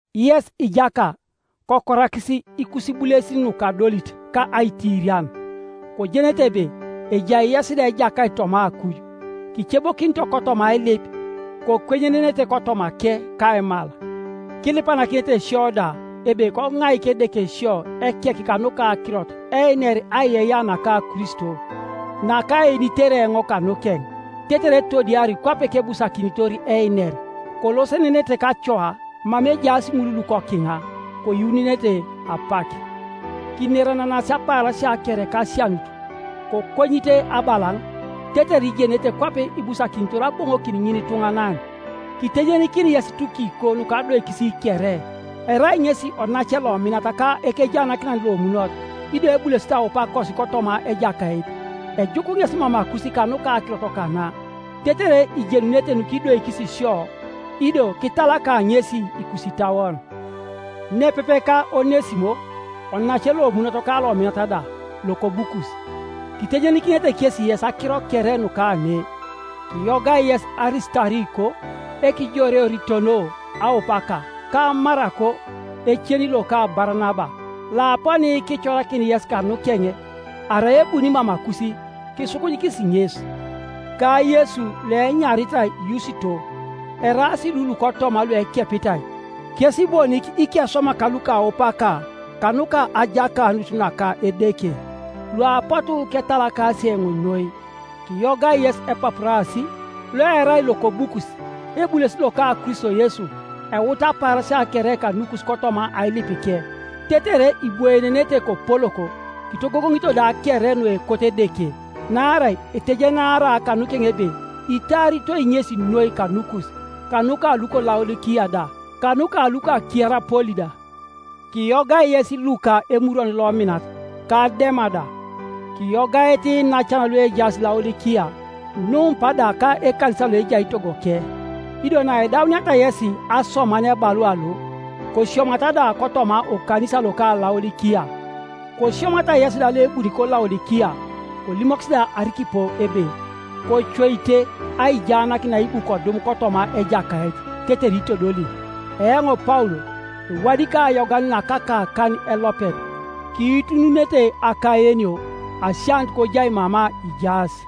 Yes ijaka, kokorakis ikusibulesin nukadolit ka aitiirian, kojenete ebe ejai yes da Ejakait toma akuj. Kicebokinito kotoma ailip, kokwenyenenete kotomake kaimal. Kilipanakinete sio da, ebe koŋaik Edeke sio ekek kanuka akirot, einer aiyeiyea naka Kristo, nakaenitere eoŋ kanukeŋ; tetere etodiari kwape kebusakinitor einer. Kolosenenete kacoa mama ejaas ŋul lukokiŋa, koyuununete apak. Kinerenenasi apaarasia kere kasianut, kokonyite abalaŋ, tetere ijenete kwape ibusakinitor aboŋonokin ŋinituŋanan. Kitejenikini yes Tukiko nukadoikis kere; erai ŋesi onace lominat ka ekejaanakinan lomunot, ido ebulesit aupakosi kotoma Ejakait. Ejuk ŋes mamakus kanuka akirot kana, tetere ijenunete nukidoikis sio, ido kitalaka ŋesi ikusitauon, nepepe ka Onesimo, onace lomunot ka lominat da, lokobukus. Kitejenikinete kesi yes akiro kere nukane. Kiyogai yes Arisitariko, ekijoreoritono aupaka, ka Marako ecen loka Baranaba, (Ioaponi kicorakin yes kanukeŋ; arai ebuni mamakus, kisukunyikis ŋes), ka Yesu loenyaritai Yusito, Eraas lu lukotoma luekepitai, kes bonik ikeswamak lukaupaka kanuka ajakanut naka Edeke, luapotu ketalakasi eoŋ noi. Kiyogai yes Epapurasi, loerai lokobukus, ebulesit loka Kristo Yesu, euta apaarasia kere kanukus kotoma ailipike, tetere ibwoenenete kopolok, kitogogoŋito da kere nuekot Edeke. Naarai etejenaara kanukeŋ ebe itaaritoi ŋesi noi kanukus, kanuka luko Laodikia da, kanuka luko Kierapoli da. Kiyogai yes Luka emurwon lominat, ka Dema da. Kiyogaete iinacan luejaas Laodikia, Numpa da ka ekanisa loejai togoke. Ido naidauniata yesi asoman ebalua lo, kosiomata da kotoma okanisa loka Laodikia; kosiomata yesi da loebuni koLaodikia. Kolimokis da Arikipo ebe, “Kocoite aijaanakin naibu kodum kotoma Ejakait, tetere itodoli.” Eoŋ Paul ewadikai ayogan na kakakan elopet. Kiitununete akaenio. Asianut kojai mama ijaas.